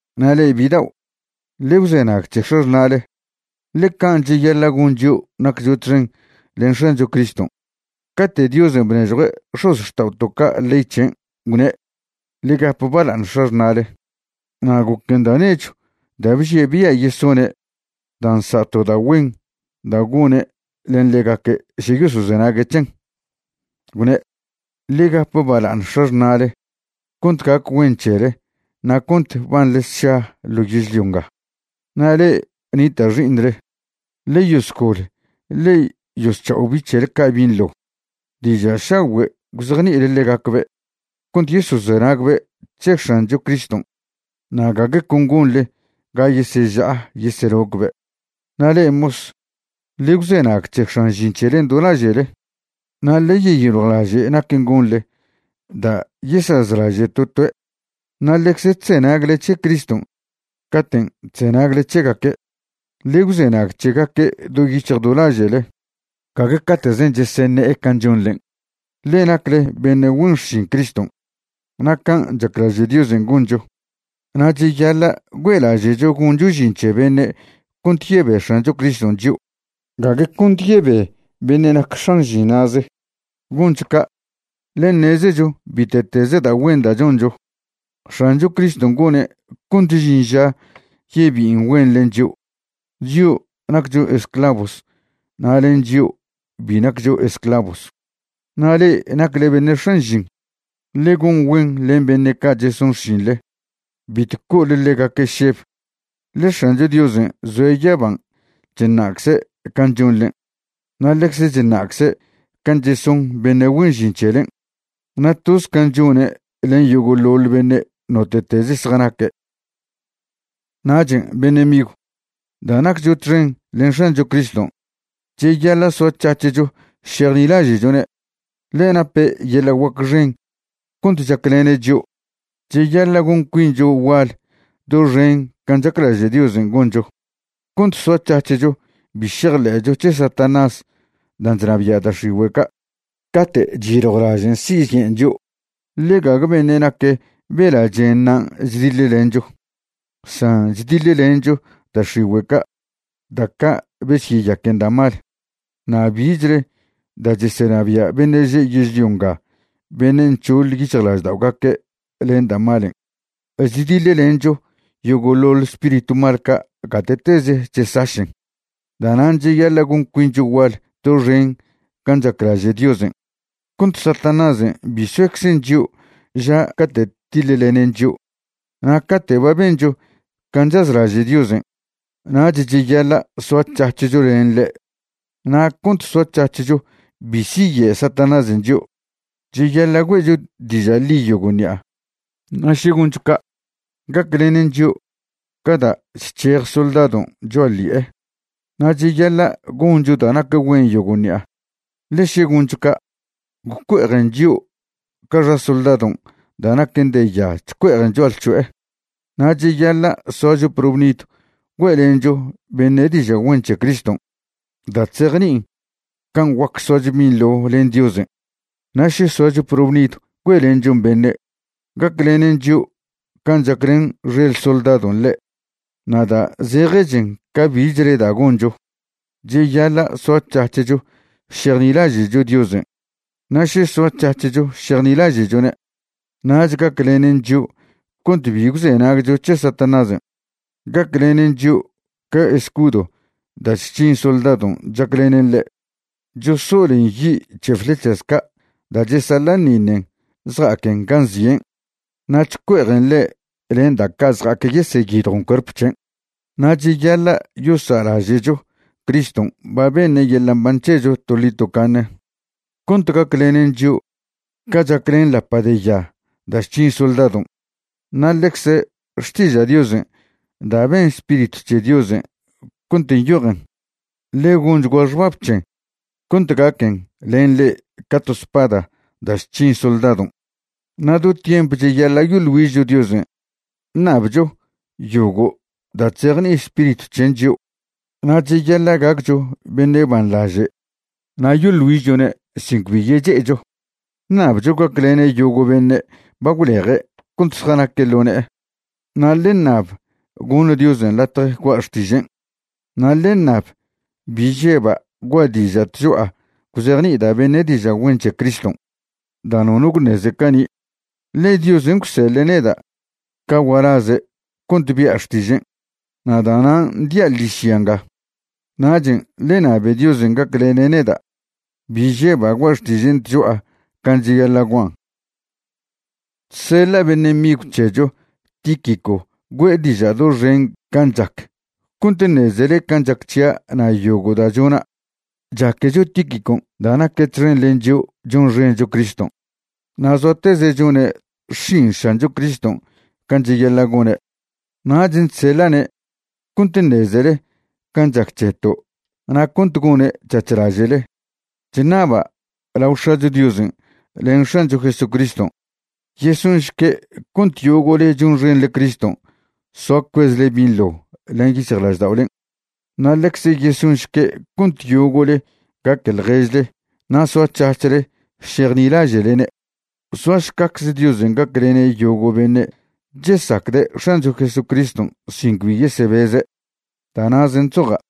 Na' le'e bidao', ḻe gwzenag c̱he x̱axṉa'le, ḻe can' cheyaḻa' gon chio' naccho txen len X̱ancho Criston'. Cate' Diosen' bnežjue' x̱ozxta'oto' ca' ley c̱hen', gwne': “Ḻe gap baḻa'aṉ x̱axṉa'le.” Na' goquen da' nechw da' bžie' bia' yesone' da' nsa' to da' güen da' gone' len ḻegaque' še yosozenague' c̱hen, gwne': “Ḻe gap bala'aṉ x̱axṉa'le cont gac güen c̱hele na' cont banḻe sša ḻo yezlio nga.” Na' le'e nita' xi'iṉle, ḻe yosgol ḻe yosc̱ha'o bi' c̱hele ca' binḻo, diža' šagüe' gwzejni'ile ḻegacbe' cont yosozenagbe' c̱he X̱ancho Criston' na' gague con gonḻe ga yeseža'a yeselocbe'. Na' le'e mos, ḻe gwzenag c̱he x̱an žin c̱helen' do laže'le na' ḻe yeyiljwlaže' naquen' gonḻe da' yesazlaže' to toe', ḻe ḻecze chzenagle c̱he Criston' caten' chzenagle c̱hegaque'. Ḻe gwzenag c̱hegaque' do yic̱hj do laže'le, gague cate'zen' cheseṉe'e can' chonḻen', ḻe nacle beṉe' güen xšin Criston', na' can' chaclaže' Diosen' goncho. Na' cheyaḻa' güe'laže'cho goncho žin c̱he beṉe' cont yebe X̱ancho Criston' chio', gague cont yebe beṉe' nac x̱an žin na'ze. Goncho ca', ḻe ṉezecho bite'teze da' güen da' choncho, X̱ancho Criston' gone' cont žin ža yebi'in güen len chio', chio' naccho esclavos na' len chio' bi naccho esclavos. Na' le'e nacle beṉe' x̱an žin, ḻe gon güen len beṉe' ca' cheson xšinḻe. Bitw co'ole ḻegaque' šeb, ḻe X̱ancho Diosen' zoe' yaban' chṉa'cze' can' chonḻen', na' ḻecze chṉa'cze' can' cheson beṉe' güen žin c̱helen', na' toz can' chone' len yogo'ḻoḻ beṉe' note'teze zjanaque'. Nachen' beṉe' migw, da' naccho txen len X̱ancho Criston', cheyaḻa' soac̱hac̱hcho šejnilaže'chone', ḻe nape' yeḻa' guac xen cont chaclene' chio'. Cheyaḻa' gon cuincho gual doxen can' chaclaže' Diosen' goncho, cont soac̱hac̱hcho bi šejḻe'cho c̱he Satanás dan' chnabia' da' x̱igüe' ca' cate' chyiljwlažen' siyen' chio'. Ḻe gague beṉe' nac bela' chenṉa' chdiḻlencho, san chdiḻlencho da' x̱igüe' ca', da' ca' besyeyaquen da' mal, na' bichle da' chesenabia' beṉe' že' yežlio nga beṉe' nc̱hoḻ yic̱hjlažda'ogaque' len da' malen'. Chdiḻlencho yogo'ḻoḻ spiritw mal ca' gate'teze chesašen. Da'nan' cheyaḻa' gon cuincho gual doxen can' chaclaže' Diosen', cont Satanásen' bi soeczen chio' ža cate' tiḻlenen chio'. Na' cate' ba bencho can' chazlaže' Diosen', nach cheyaḻa' soac̱hac̱hcho len ḻe'. Na' cont soac̱hac̱hcho bi siye' Satanásen' chio', cheyaḻa' güe'cho diža' ḻi yogo' ṉi'a. Na' še goncho ca', gaclenen chio' ca da' chc̱hej soldadon' cho'a ḻi'e. Na' cheyaḻa' goncho da' nac güen yogo' ṉi'a, ḻe še goncho ca', gwcue'ejen chio' ca xa soldadon' da' naquen de ya chcue'ejen cho'alc̱ho'e. Na' cheyaḻa' soacho probnidw güe'lencho beṉe' diža' güen c̱he Criston' da' chzejni'in can' guac soacho binḻo len Diosen'. Na' še soacho probnidw güe'lenchon beṉe', gaclenen chio' can' chaclen xel soldadon' ḻe'. Na' da' zejechen ca bichle da' goncho, cheyaḻa' soac̱hac̱hcho šejnilaže'cho Diosen'. Na' še soac̱hac̱hcho šejnilaže'chone', nach gaclenen chio' cont bi gwzenagcho c̱he Satanásen'. Gaclenen chio' ca escudo da' chc̱hin soldadon' chaclenen ḻe', chosolen yi' c̱he flechas ca' da' chesaḻa'ṉiṉen zja'aquen gan' zien', na' chcue'ejen ḻe' len da' ca' zja'ac yeseyidjon cuerp c̱hen'. Na' cheyaḻa' yosa'laže'cho Criston' ba beṉe' yeḻa' mban c̱hecho toḻi tocaṉe, cont gaclenen chio' ca chaclen lapa' de ya da' chc̱hin soldadon'. Na' ḻecze Xtiža' Diosen' da' ben Spiritw c̱he Diosen' cont nyojen, ḻe gonchgua xbab c̱hen cont gaquen len le'e ca to spada da' chc̱hin soldadon'. Na' do tiemp cheyaḻa' yoḻ güižcho Diosen' ṉabcho yogo' da' chzejni'i Spiritw c̱hen' chio'. Na' cheyaḻa' gaccho beṉe' banḻaže' na' yoḻ güižchone' sin cbi yeche'echo, ṉabcho gaclene' yogo' beṉe' ba gwleje' cont zjanaque' ḻo ne'e. Na' ḻe ṉab goṉ Diosen' latje gua' xtižen', na' ḻe ṉab bi žeba' gua' diža' tcho'a gwzejni'ida' beṉe' diža' güen c̱he Criston' da' nono gwṉeze cani'. Ḻe Diosen' gwseḻe' neda' ca gualaze' cont bia' xtižen', na' da'nan' dia' ḻižya nga. Nachen' ḻe ṉabe Diosen' gaclene' neda' bi žeba' gua' xtižen' tcho'a can' cheyaḻa' guan'. Chseḻa' beṉe' migw c̱hecho Tíquico güe'e diža' doxen can' chac cont ṉezele can' chac c̱hia' na' yogo' da' chona'. Chaquecho Tíquicon' da' naque' txen len chio' chonxencho Criston' na' zoateze' chone' xšin X̱ancho Criston' can' cheyaḻa' gone'. Nachen' chseḻa'ne' cont ṉezele can' chac c̱heto' na' cont gone' c̱hac̱h laže'le. Chṉaba' lao X̱acho Diosen' len X̱ancho Jesucriston' yesonšque' cont yogo'le chonxenle Criston' soa cuezle binḻo len yic̱hjlažda'olen', na' ḻecze yesonšque' cont yogo'le gaque ḻježle na' soac̱hac̱hle šejnilaže'lene'. Soašcacze Diosen' gaclene' yogo' beṉe' chesacde' X̱ancho Jesucriston' sin cbi yesebeze'. Da' na'zen' chzoja'.